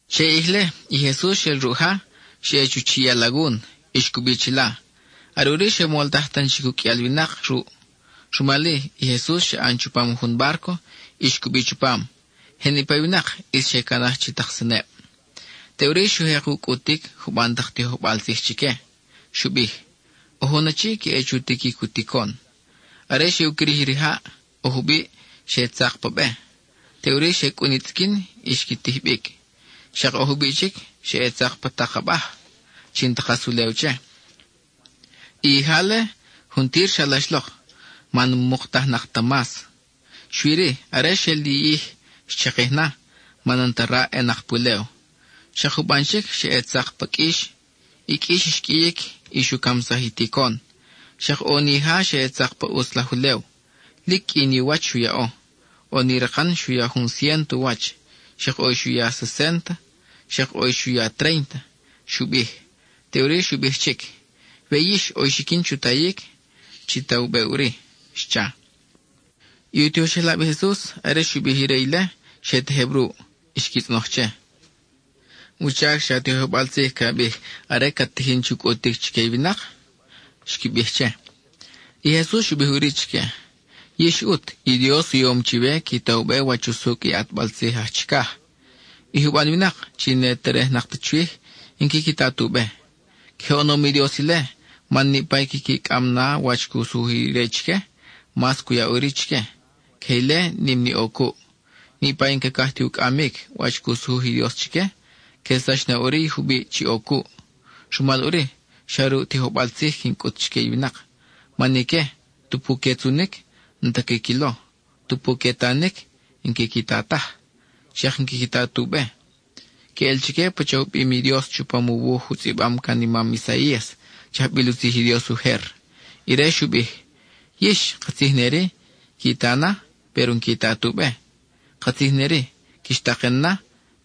Che i ʼij-le, i Jesus xel ruʼ ja, xa ʼe chu chiʼ i alagun, y xcubi chila. Are ʼuri xe moltaj tan chic uqʼuial winak ruʼ. Rumal-i, i Jesus xa ʼan chupam jun bárco, y xcubi chupam. Je niʼpa i winak ʼis xe canaj chi tak seneb. Teʼuri xu jek u cʼutic juban tak tijojbal tzij chique. Xu bij: —ʼO jun achi ca ʼe chu tiquic u ticon. Are xe u quirij i rijaʼ, ʼo jubiʼ xa ʼe tzak pa be. Teʼuri xe cʼun i tzʼiquin y xqui tij bic. Xak ʼo jubiʼ chic xa ʼe tzak pa tak abaj, chi n-ta kas ulew che. I ija-le, juntir xalax lok, man n-muktajnak ta mas. Xui-ri, are xel li ʼij, xchakij na, man n-ta raʼ ʼenak pulew. Xak juban chic xa ʼe tzak pa qʼuix; i qʼuix xqʼuiyic, y xu camsaj i ticon. Xak ʼo ni ija xa ʼe tzak pa ʼutz laj ulew; lic qʼui ni u wach xu yaʼo. ʼO ni rakan xu ya jun ciénto u wach; xak ʼo i xu ya sesénta; xak ʼo i xu ya tréinta —xu bij. Teʼuri xu bij chic: —We yix ʼo i xiquin chu tayic, chi ta u be ʼuri —xcha. I u tijoxelab i Jesus, are xu bij ire ile, xe tejeb ruʼ. Xqui tzʼonoj che: —¿Wuchac xa tijojbal tzij ca bij are cat tijin chu cʼutic chique i winak? —xqui bij che. I Jesus xu bij ʼuri chique: —Yix ʼut, i Dios u yom chiwe qui ta u be wach usucʼ i ʼatbal tzij aj chicaj. I juban winak (chi n-que terej ta chwij) n-quiqui ta tu be. Queje oʼonom i Dios ile, man niʼpa i quiqui cʼam na wach cu sujuj ire chique, mas cu ya ʼuri chique; queje ile nim ni ʼo cuʼ. Niʼpa i n-cacaj ti u cʼamic wach cu sujuj i Dios chique, quelsax na ʼuri i jubiʼ chi ʼo cuʼ. Rumal ʼuri, xa ruʼ tijojbal tzij quin cʼut chique i winak, man ique, tupu que tzunic, n-ta quiquilo; tupu que tanic, n-quiqui ta taj, xak n-quiqui ta tu be. Queʼel chique pacha u bim i Dios chupam u wuj u tzʼibam can i mam Isaías chi ajbil u tzij i Dios ujer; ire xu bij: Yix, katzij neri, qui ta na, péro n-qui ta tu be; katzij neri, quix taken na,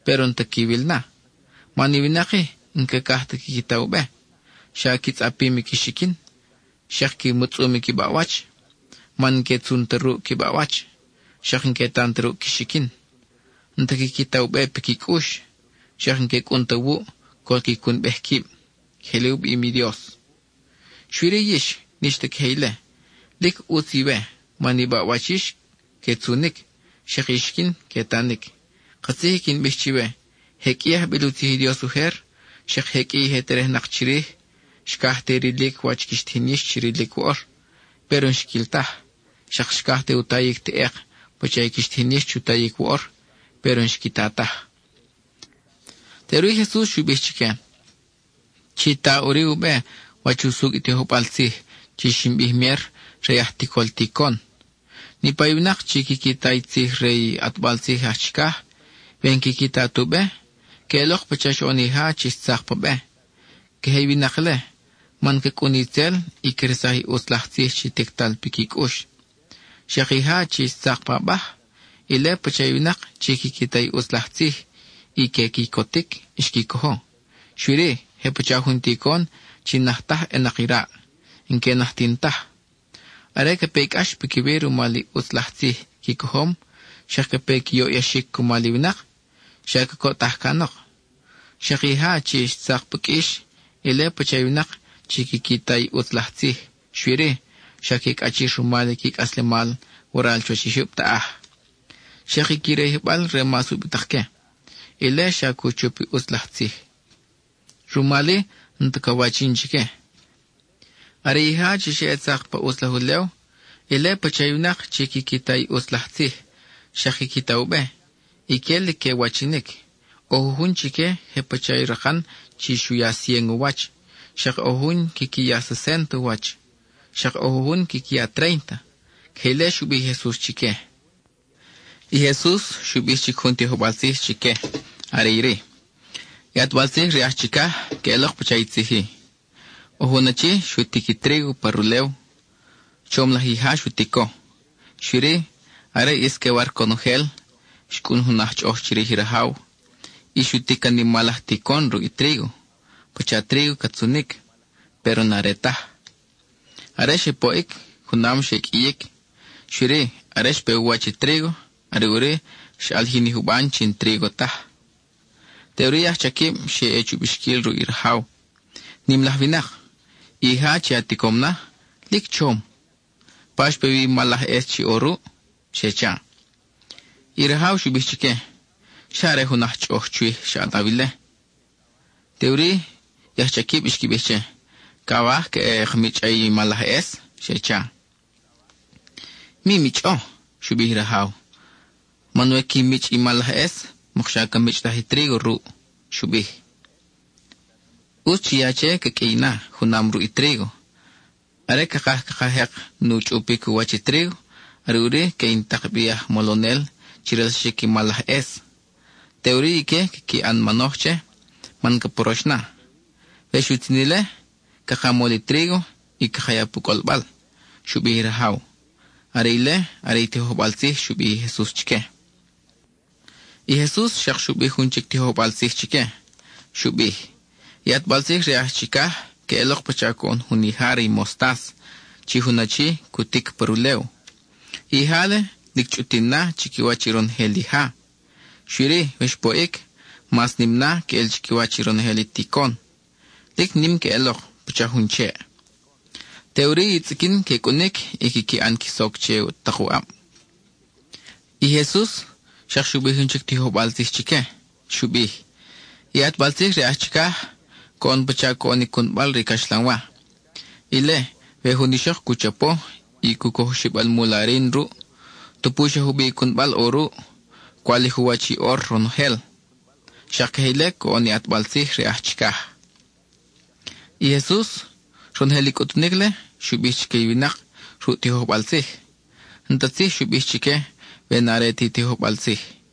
péro n-ta quiwil na. Man i winak-i, n-cacaj ta quiqui ta u be, xa qui tzʼapim i qui xiquin, xak qui mutzʼum i qui baʼwach, man n-que tzun ta ruʼ qui baʼwach, xak n-que tan ta ruʼ qui xiquin. N-ta quiqui ta u be piqui cʼux, xak n-que cʼun ta wuʼ, col qui cunbej quib. (Queje ile u bim i Dios.) Xui-ri yix, n-ix ta queje ile. Lic ʼutz iwe, man i baʼwach yix que tzunic, xak i xiquin que tanic. Katzij i quin bij chiwe, je qʼui i ajbil u tzij i Dios ujer, xak je qʼui i je terejnak chirij, xcaj te rilic wach quix tijin yix chi rilic woʼor, péro n-xquil taj; xak xcaj u tayic teʼek pacha i quix tijin yix chu tayic woʼor, péro n-xqui ta taj. Teʼuri Jesus xu bij chique: —Chi ta ʼuri u be wach usucʼ i tijojbal tzij chi xin bij mier re i aj ticol ticon. Niʼpa i winak chi quiqui ta i tzij re i ʼatbal tzij aj chicaj, we n-quiqui ta tu be, queʼelok pacha xoʼon ija chi xtzak pa be. Queje i winak-le, man ca cʼun itzel, y cresaj i ʼutz laj tzij chi tictal piqui cʼux. Xak i ija chi xtzak pa abaj, ile pacha i winak chi quiqui ta i ʼutz laj tzij, y que quicotic xqui cojo. Xui-ri, je pacha jun ticon chi n-naj taj ʼenak i raʼ; n-que najtin taj. Are ca pe i cʼax piquiwi rumal i ʼutz laj tzij qui cojom, xak ca pe i qui yoʼyaxic cumal i winak, xa cacoʼtaj canok. Xak i ija chi xtzak pa qʼuix, ile pacha i winak chi quiqui ta i ʼutz laj tzij, xui-ri, xa que cʼachir rumal i qui cʼaslemal waral chuwach i jyub taʼaj, xak i qui rayijbal re mas ubitak que; ile xa cu chup i ʼutz laj tzij. Rumal-i n-ta ca wachin chique. Are ija chi xe ʼe tzak pa ʼutz laj ulew, ile pacha i winak chi quiqui ta i ʼutz laj tzij, xak quiqui ta u be. Ique lic que wachinic; ʼo jujun chique je pacha i rakan chi xu ya cien u wach; xak ʼo jujun quiqui ya sesénta u wach; xak ʼo jujun quiqui ya tréinta. (Queje ile xu bij i Jesus chique.) I Jesus xu bij chic jun tijojbal tzij chique, are iri: —I ʼatbal tzij re aj chicaj, queʼelok pacha i tzij-i: ʼO jun achi xu tic i trígo pa rulew; chom laj ija xu tico. Xui-ri, are ʼis que war conojel, xcʼun jun aj chʼoʼoj chirij i rajaw, y xu tic can mal laj ticon ruʼ i trígo (pacha trígo ca tzunic, péro n-are taj). Are xe poʼic, junam xe qʼuiyic; xui-ri, are xpe u wach i trígo, are ʼuri xaʼalijin i juban chi n-trígo taj. Teʼuri i ajchaquib xe ʼe chu bixquil ruʼ i rajaw: “Nim laj winak, i ija chi a ticom na, lic chom, ¿pa xpe wi i mal laj ʼes chi ʼo ruʼ?” xe cha. I rajaw xu bij chique: “Xa are jun aj chʼoʼoj chwij xa ʼanaw ile.” Teʼuri i ajchaquib xqui bij che: “¿Cawaj ca ʼe ka michʼa i mal laj ʼes?” xe cha. “Mi michʼo,” xu bij i rajaw, “man we qui michʼ i mal laj ʼes, mokxa ca michʼtaj i trígo ruʼ,” xu bij. “ʼUtz chi ya che ca qʼuiy na, junam ruʼ i trígo. Are cakaj caka jek nu chʼupic u wach i trígo, are ʼuri que in tak bi i aj molonel chi relsaxic i mal laj ʼes. Teʼuri ique quiqui ʼan manoj che, man ca porox na. We xutzin ile, caka mol i trígo y caka ya pu cʼolbal,” xu bij i rajaw. (Are ile are i tijojbal tzij xu bij i Jesus chique.) I Jesus xak xu bij jun chic tijojbal tzij chique. Xu bij: —I ʼatbal tzij re aj chicaj queʼelok pacha coʼon jun ija re i mostas, are jun achi cu tic pa rulew. I ija-le, lic chʼutin na chiquiwach i ronojel ija. Xui-ri, we xpoʼic, mas nim na queʼel chiquiwach i ronojel i ticon. Lic nim queʼelok, pacha jun cheʼ; teʼuri i tzʼiquin que cʼunic y quiqui ʼan qui soc che tak u ʼab. I Jesus xak xu bij jun chic tijojbal tzij chique. Xu bij: —I ʼatbal tzij re aj chicaj coʼon pacha coʼon i cunbal re i caxlanwa. Ile, we jun ixok cu chapo, y cu coj oxib almul arin ruʼ, tupu xa jubiʼ i cunbal ʼo ruʼ, cwalij u wach i ʼor ronojel. (Xak queje ile coʼon i ʼatbal tzij re aj chicaj.) I Jesus, ronojel i cʼutunic-le, xu bij chique i winak ruʼ tijojbal tzij; n-ta tzij xu bij chique, we n-are ti tijojbal tzij.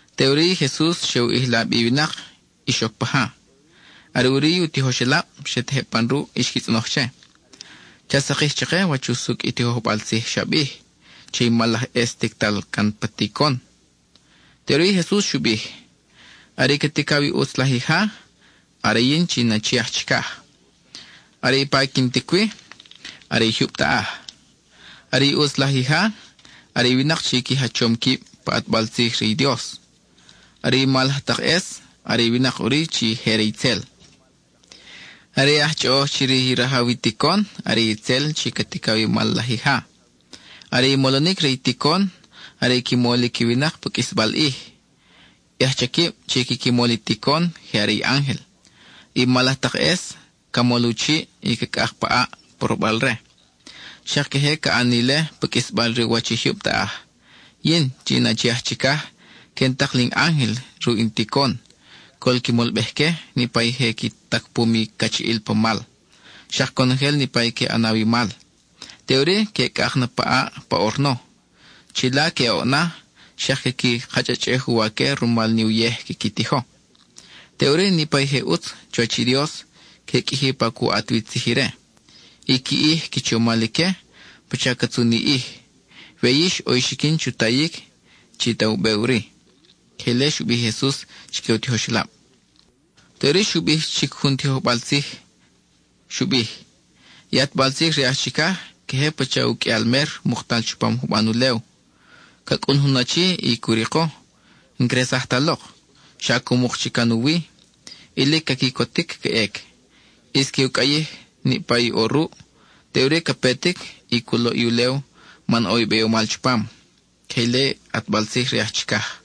Teʼuri i Jesus xe u ʼijla bi i winak y xoc pa ja. Are ʼuri i u tijoxelab xe tejeb pan ruʼ y xqui tzʼonoj che: —Cha sakij chake wach usucʼ i tijojbal tzij xa bij, che i mal laj ʼes tictal can pa ticon. Teʼuri i Jesus xu bij: —Are i ca ticaw i ʼutz laj ija, are yin chi in Achi aj Chicaj. Are i pa quin tic wi, are i jyub taʼaj. Are i ʼutz laj ija, are i winak chi qui jachom quib pa ʼatbal tzij re i Dios; are i mal laj tak ʼes, are i winak ʼuri chi je re itzel. Are i aj chʼoʼoj chirij i rajaw i ticon, are itzel chi ca ticaw i mal laj ija. Are i molonic re i ticon, are i qui molic i winak pa qʼuisbal ʼij. I ajchaquib chi quiqui mol i ticon, je are i ángel. I mal laj tak ʼes, ca mol u chiʼ, y ca cʼak pa ʼaʼ porobal-re. Xak queje ca ʼan ni ile pa qʼuisbal re u wach i jyub taʼaj. Yin, chi in Achi aj Chicaj, que in tak li in ángel ruʼ in ticon, col qui molbej-que niʼpa i je qui tacpum i cachiʼil pa mal, xak conojel niʼpa i que ʼanaw i mal. Teʼuri que cʼak na pa ʼaʼ pa orno. Chila que oʼ na; xak quiqui kachʼachʼej uwaque rumal ni uyej quiqui tijo. Teʼuri, niʼpa i je ʼutz chuwach i Dios, que qʼuiji pa cu ʼat wi tzij ire. I qui ʼij qui chomal ique, pacha ca tzun i ʼij. We yix ʼo i xiquin chu tayic, chi ta u be ʼuri. (Queje ile xu bij i Jesus chique u tijoxelab.) (Teʼuri xu bij jun chic tijojbal tzij. Xu bij:) —I ʼatbal tzij re aj chicaj queje pacha uqʼuial mer muktal chupam juban ulew. Ca cʼun jun achi y cu riko. N-xresaj ta lok, xa cu muk chic can u wi, y lic ca quicotic ca ʼec; ʼis que u cʼayij na niʼpa i ʼo ruʼ. Teʼuri ca petic y cu loʼ i ulew man ʼo i beyomal chupam. (Queje ile i ʼatbal tzij re aj chicaj.)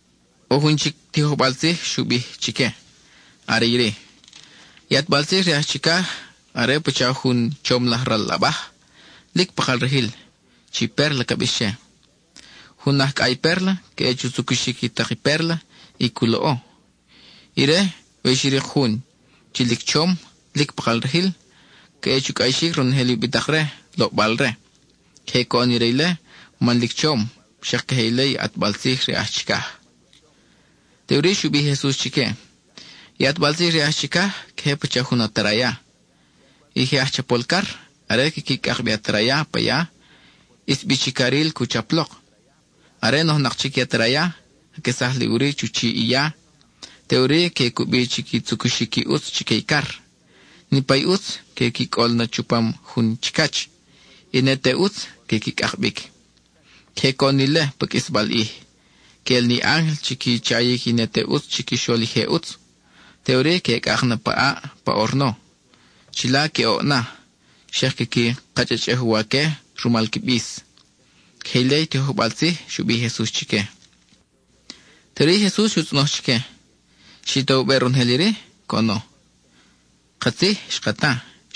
(ʼO jun chic tijojbal tzij xu bij chique, are iri:) —I ʼatbal tzij re aj chicaj are pacha jun chom laj ral abaj, lic pakal rajil, pérla ca bix che. Jun aj cʼay pérla, ca ʼe chu tzucuxic i tak i pérla, y cu loʼo. Ire, we xu rik jun chi lic chom, lic pakal rajil, ca ʼe chu cʼayixic ronojel i ubitak-re, loʼbal-re. (Queje coʼon ire ile man lic chom; xak queje ile i ʼatbal tzij re aj chicaj.) (Teʼuri xu bij i Jesus chique:) —I ʼatbal tzij re aj chicaj queje pacha jun ataraya. I je aj chapol car, are quiqui cʼak bi i ataraya pa ya, ʼis bi chi caril cu chap lok. Are nojnak chic i ataraya, caquesaj li ʼuri chu chiʼ i ya. Teʼuri que cubi chi qui tzucuxic i ʼutz chique i car. Niʼpa i ʼutz, que qui cʼol na chupam jun chicach; i ne te ʼutz, que qui cʼak bic. Queje coʼon ni ile pa qʼuisbal ʼij; que ʼel ni ángel chi qui chayic i ne te ʼutz chiquixol i je ʼutz. Teʼuri que cʼak na pa ʼaʼ pa orno. Chila que oʼ na; xak quiqui kachʼachʼej uwaque rumal qui bis. (Queje ile i tijojbal tzij xu bij i Jesus chique.) Teʼuri i Jesus xu tzʼonoj chique: —¿Xi ta u be ronojel iri? —coʼono. Katzij —xqui bij—, xka ta.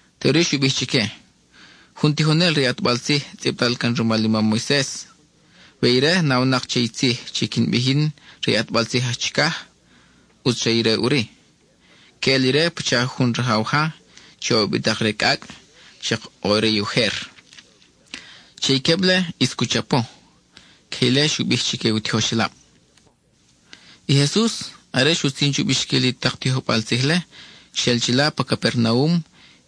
Teʼuri xu bij chique: —Jun tijonel re i ʼatbal tzij tzʼibtal can rumal i mam Moises, we ire nawnak che i tzij chi quin bij yin re i ʼatbal tzij aj chicaj, ʼutz re ire ʼuri. Queʼel ire pacha jun rajaw ja chi ʼo ubitak-re cʼacʼ, xak ʼo i re ujer. Che i queb-le ʼis cu chapo. (Queje ile xu bij chique u tijoxelab.) I Jesus, are xutzin chu bixquil i tak tijojbal tzij-le, xel chila pa Capernaum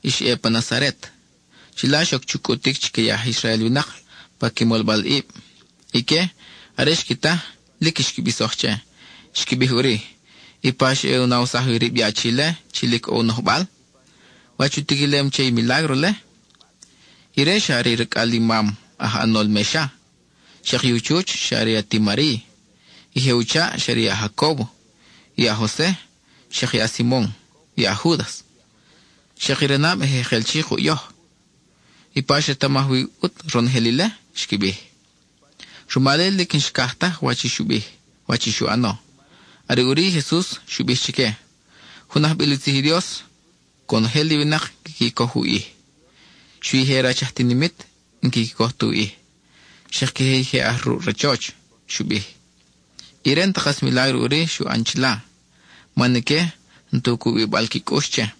y xa ʼe pa Nazaret. Chila xoc chu cʼutic chique i aj Israel winak pa qui molbalʼib. Ique, are xqui ta, lic xqui bisoj che. Xqui bij ʼuri: —¿Ipa xa ʼe u nawsaj wi rib i achi-le, chi lic ʼo u nojbal? ¿Wach u tiquilem che i milágro-le? Ire xa are racʼal i mam chi aj ʼanol mexa, xak i u chuch xa are ati Mariy. I je u chaʼ xa are i a-Jacóbo, i a-Jose, xak i a-Simon, i a-Júdas. Xak i ranab je jekel chi kuʼ yoj. ¿Ipa xretamaj wi ʼut ronojel ile? —xqui bij. Rumal-i, lic n-xcaj taj wach i xu bij, wach i xu ʼano. Are ʼuri i Jesus xu bij chique: —Jun ajbil u tzij i Dios, conojel i winak quiqui coj u ʼij, xui i je rach aj tinimit n-quiqui coj tu ʼij, xak queje i je aj ruʼ rachoch —xu bij. Ire n-ta kas milágro ʼuri xu ʼan chila, man ique n-ta u cubibal qui cʼux che.